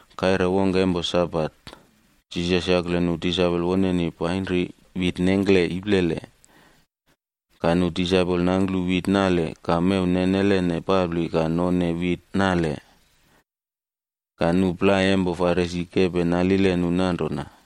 Kaire wongke empo Sabat, Jisas yakle nu disaipol woneni painri wit nengkle iplele. Ka nu disaipol nangklu wit nale ka mew nenelene papli ka none wit nale. Ka nu plai empo Farisi kepe nalile nu nanrona,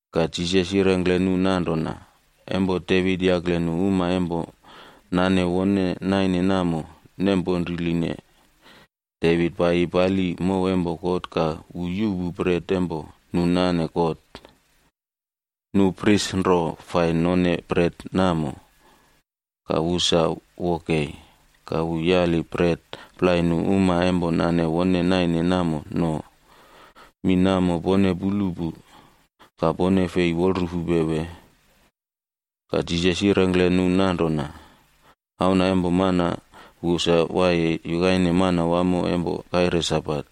Ka Jisas yirengkle nu nanrona, “Empo Devit yakle nu uma empo nane wone naine namo nem ponriline. Devit paiyi pali mow empo God ka wu yuꞌpu bret empo nu nane God. Nu pris nro fai none bret namo, ka wu sa wo kei. Ka wu yali bret plai nu uma empo nane wone naine namo no. Mi namo pone pulu pu, ka pone fei wolrufupe, wee?” Ka Jisas yirengkle nu nanrona, “Auna empo Mana wu sa waiye yukaine Manawamo empo kaire Sabat.”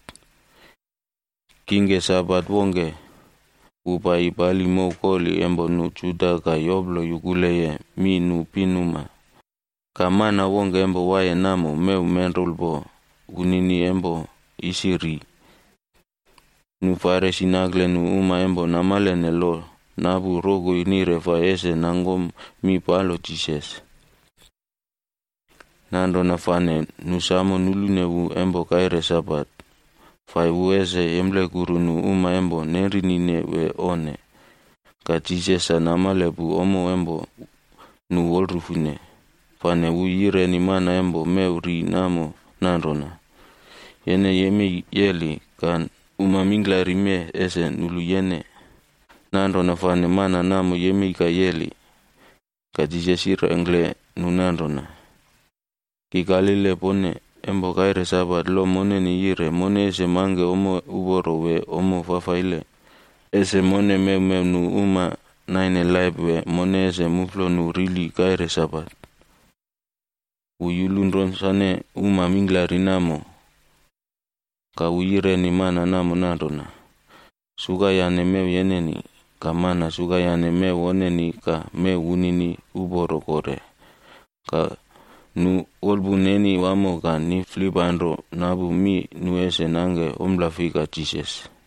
Kingke Sabat wongke, wu paiyi pali mow koli empo nu Juda ka yoplo yukuleye mi nu pinuma. Ka mana wongke empo waiye namo mewmenrulpo wunini empo isi ri. Nu Farisi nakle nu uma empo namalene lo napu rokoi nire fai ese nangkom mi palo Jisas. Nanrona fane nu samo nulune wu empo kaire Sabat, fai wu ese yemplekuru nu uma empo nenrinine wee onne. Ka Jisas sa namale pu ommo empo nu wolrufune, fane wu yireni mana empo mew ri namo nanrona, “Yene yemei yeli ka uma mingklari mee ese nulu yene.” Nanrona fane mana namo yemei ka yeli. Ka Jisas yirengkle nu nanrona, “Ki kalile pone, empo kaire Sabat lo moneni yire mone ese mangke ommo uporo wee ommo fafaile? Ese mone mewmew nu uma naine laip wee mone ese muflo nu rili kaire Sabat?” Wu yulun ronsane uma mingklari namo, ka wu yireni mana namo nanrona, “Sukayane mew yeneni.” Ka mana sukayane mew woneni ka mew wunini uporo kore. Ka nu wolpun neni wamo ka niflipanro napu mi nu ese nangke ompla fika Jisas.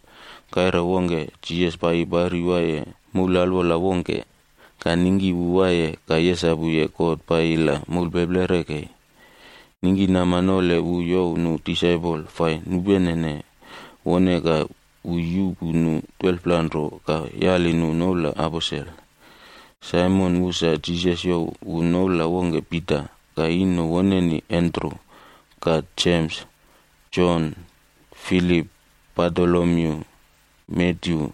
Kaire wongke, Jisas paiyi pari waiye moul alwola wongke, ka ningki wu waiye ka yesapuye God paiyi la moulpeplere kei. Ningkinama nole wu youw nu disaipol fai nupenene wone ka wu yuꞌpu nu 12pla nro ka yali nu noula aposel:b Saimon, wu sa Jisas youw wu noula wongke Pita, ka ino woneni Andru, ka Jems, Jon, Filip, Bartolomyu, Matyu,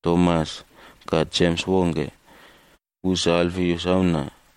Tomas ka Jems wongke, wu sa Alfius auna,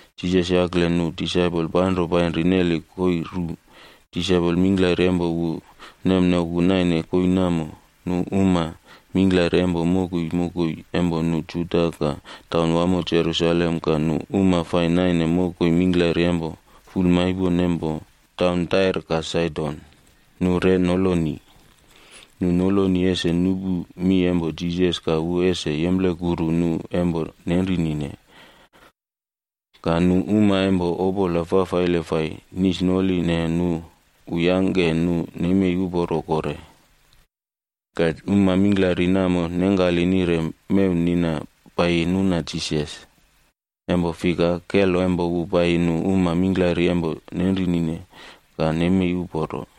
Jisas yakle nu disaipol panro painri neli koii ru. Disaipol mingklari empo wu nemnoku naine koii namo. Nu pinuma mingklari empo mokoi mokoi empo nu Juda ka taun wamo Jerusalem ka nu uma fai naine mokoi mingklari empo fulmaipon empo taun Tair ka Saidon,d nu re noloni. Nu noloni ese nupu mi empo Jisas ka wu ese yemplekuru nu empo nenrinine. Ka nu uma empo opola fafaile fai nisnoline nu, wu yangke nu nemei uporo kore. Ka uma mingklari namo nengkali nire mew nina paiyi nuna Jisas, empo fika, kelo empo wu paiyi nu uma mingklari empo nenrinine ka nemei uporo.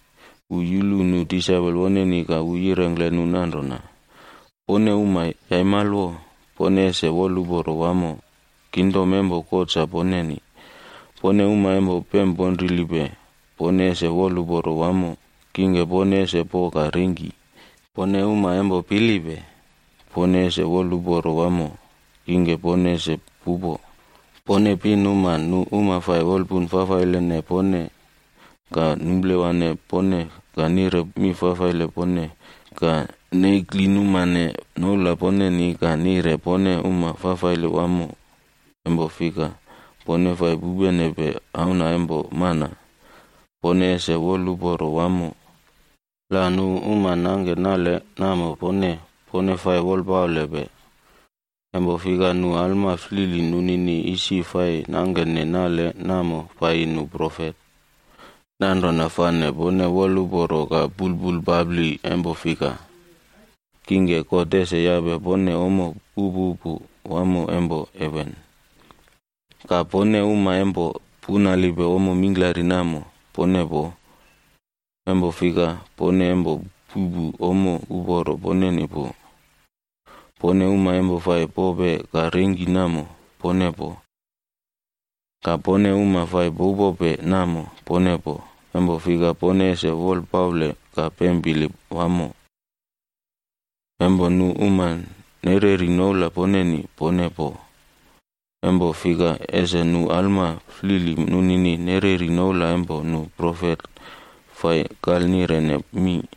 Wu yulu nu disaipol woneni ka wu yirengkle nu nanrona: “Pone uma yaimalwo, pone ese woluporo wamo. Kingdom empo God sa poneni. Pone uma empo pemponrilipe, pone ese woluporo wamo, kingke pone ese po ka rengki. Pone uma empo pilipe, pone ese woluporo wamo, kingke pone ese pupo. Pone pinuma nu uma fai wolpun fafailene pone ka numplewane pone ka nire mi fafaile pone ka neklinumane noula poneni ka nire pone uma fafaile wamo, empo fika, pone fai pupenepe Auna empo Mana, pone ese aiyem wamo. “La nu uma nangke nale namo pone, pone fai wolpaulepe. Empo fika nu alma flili nunini isi fai nangkene nale namo paiyi nu profet. Nanrona fane pone aiyem ka pulpulpapli empo fika, kingke God ese yape pone ommo upupu wamo empo heven. Ka pone pinuma empo punalipe ommo mingklari namo, pone poo, pone empo puꞌpu ommo pu ese yangke wolpuna poneni uporo. Pone uma empo fai pope ka rengki namo, pone poo, kingke pone ese pemponrili. Ka pone uma fai pupope namo, pone poo, empo fika pone ese wolpaule ka pempili wamo. La empo nu uma nereri noula poneni, pone poo, empo fika isi nu alma flili nunini nereri noula empo nu profet fai kalnirene mi.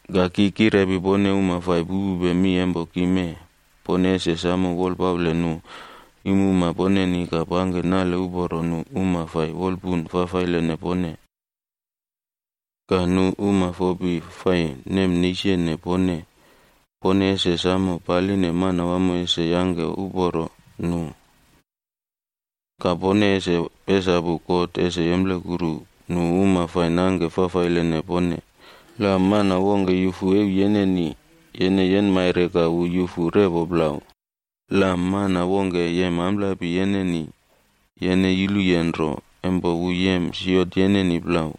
“Ka ki kirepi pone uma fai pupupe mi empo ki mee, pone ese samo wolpale nu iimuma poneni ka pangke nale uporo nu uma fai wolpun fafailene pone. Ka nu uma fopi fai nemneisene pone, pone ese samo paline Manawamo ese yangke uporo nu. Ka pone ese pesapu God ese yemplekuru nu uma fai nangke fafailene pone. La mana wongke yufu euw yeneni, yene yenmaire ka wu yufu repo plau. La mana wongke yem amplapi yeneni, yene yuluye nro empo wu yem siot yeneni plau.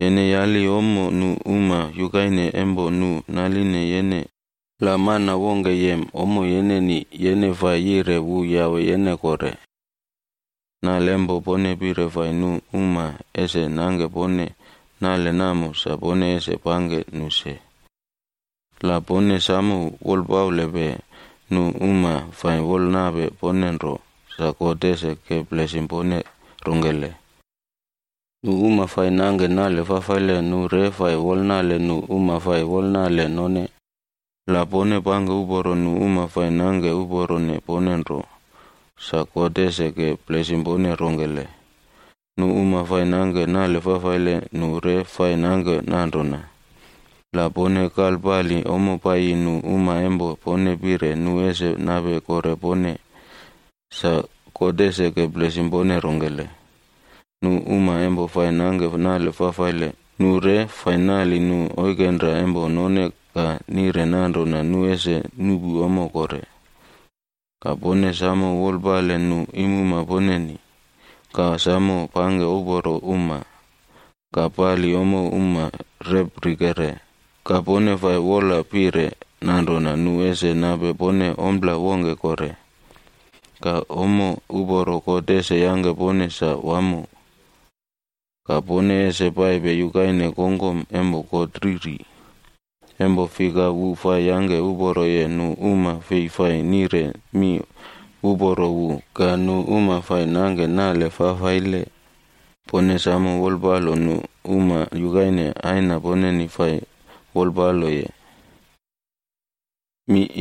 Yene yali ommo nu uma yukaine empo nu naline yene. La mana wongke yem ommo yeneni, yene fai yire wu yawe yene kore. Nale empo pone pire fai nu uma ese nangke pone, nale namo sa pone ese pangke nu se. “La pone samo wolpalepe nu uma fai wolnape pone nro, sa God ese ke blesim pone rongkele? Nu uma fai nangke nale fafaile nu re fai wolnale nu uma fai wolnale none. La pone pangke uporo nu uma fai nangke uporone pone nro, sa God ese ke blesim pone rongkele? Nu uma fai nangke nale fafaile nu re fai nangke nanrona. La pone kalpali ommo paiyi nu uma empo pone pire nu ese nape kore pone, sa God ese ke blesim pone rongkele? Nu uma empo fai nangke nale fafaile, nu re fai nali nu oikenra empo none ka nire nanrona nu ese nuꞌpu ommo kore. Ka pone samo wolpale nu iimuma poneni, ka samo pangke uporo uma, ka pali ommo uma reprikere ka pone fai wolapire nanrona nu ese nape pone ompla wongke kore. Ka ommo uporo God ese yangke pone sa wamo, ka pone ese paipe yukaine kongkom empo God Riri. Empo fika wu fai yangke uporoye nu uma fei fai nire mi uporo wu ka nu uma fai nangke nale fafaile. Pone samo wolpalo nu uma yukaine Aina poneni fai wolpaloye nu.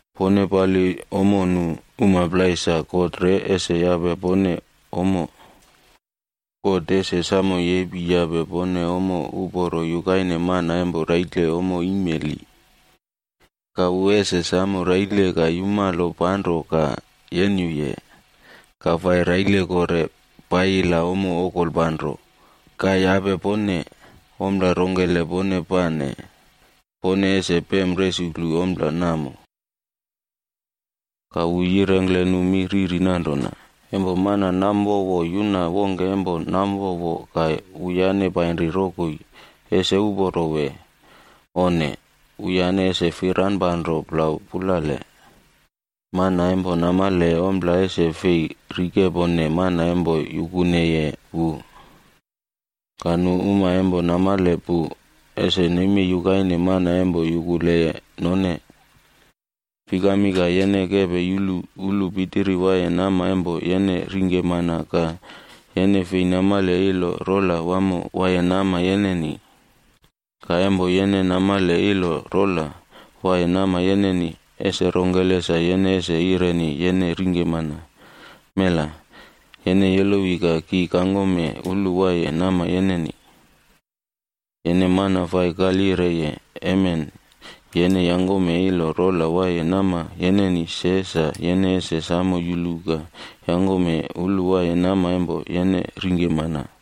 Pone pali ommo nu uma plai sa God re ese yape pone ommo. God ese samo yepi yape pone ommo uporo yukaine mana empo raile ommo imeli, ka wu ese samo raile ka yumalo panro ka yenyuye, ka fai raile kore, paiyi la ommo okolpanro, ka yape pone. Ompla rongkele pone pane, pone ese pem resuklu ompla namo.” Ka wu yirengkle nu mi riri nanrona, “Empo mana namwowo yuna wongke empo namwowo ka wuyane painri rokoi, ese uporo wee? Onne, wuyane ese firanpanro plau pulale. Mana empo namaleye ompla ese fei rikepone mana empo yukuneye wu, ka nu uma empo namale pu ese nemei yukaine mana empo yukuleye none. “Fikami ka yene kepe yulu ulu pitiri waiye nama empo yene ringke mana ka yene fei namale ilo rola wamo waiye nama yeneni? Ka empo yene namale ilo rola waiye nama yeneni, ese rongkele sa yene ese yireni yene ringke mana, ‘Mela, yene yolowi ka ki kangkome ulu waiye nama yeneni.’ Yene mana fai kalyireye, emen yene yangkome ilo rola waiye nama yeneni se sa yene ese samo yulu ka yangkome ulu waiye nama empo yene ringke mana.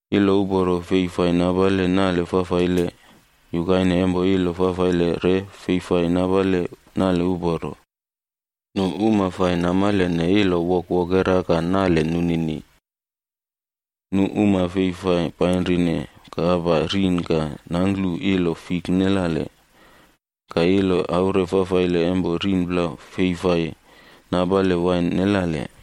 “Ilo uporo fei fai napale nale fafaile, yukaine empo ilo fafaile re fei fai napale nale uporo. Nu uma fai namalene ilo wokwokera ka nale nunini. Nu uma fei fai painrine kapa rin ka nangklu ilo fik nelale, ka ilo aure fafaile empo rin plau fei fai napale wain nelale.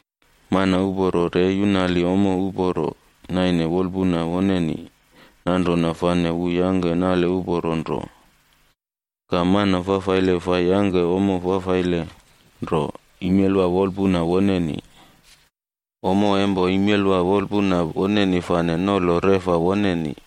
Mana uporo re yunali ommo uporo naine wolpuna woneni, nanrona fane wu yangke nale uporo nro. Ka mana fafaile fai yangke ommo fafaile nro imelwa wolpuna woneni. Ommo empo imelwa wolpuna woneni fane nolo reꞌfa woneni.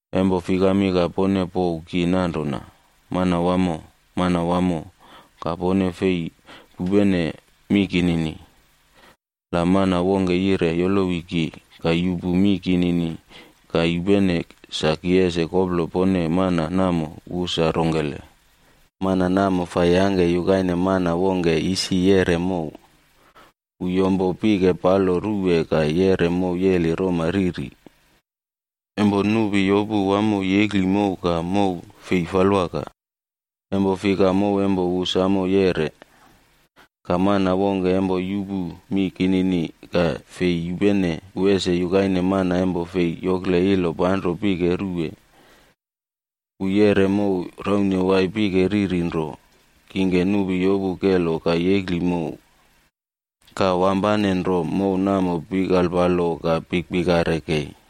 “Empo fikami ka pone pouw ki nanrona, ‘Manawamo, Manawamo,’ ka pone fei pupene mi kinini? La mana wongke yire yolowi ki, ka yupu mi kinini ka yupene, sa ki ese koplo pone mana namo wu sa rongkele. “Mana namo yangke yukaine mana wongke isi yeꞌre mow. Wu yompo pike palo ruwe ka yeꞌre mow yeli roma riri. Empo nupi yopu wamo yekli mow ka mow fei falwaka, empo fika mow empo wu samo yeꞌre. Ka mana wongke empo yupu mi kinini ka fei yupene, wu ese yukaine mana empo fei yokle ilo panro pike ruwe. Wu yeꞌre mow raune waiye pike riri nro. Kingke nupi yopu kelo ka yekli mow, ka wampanenro mow namo pikalpalo ka pikpikare kei.”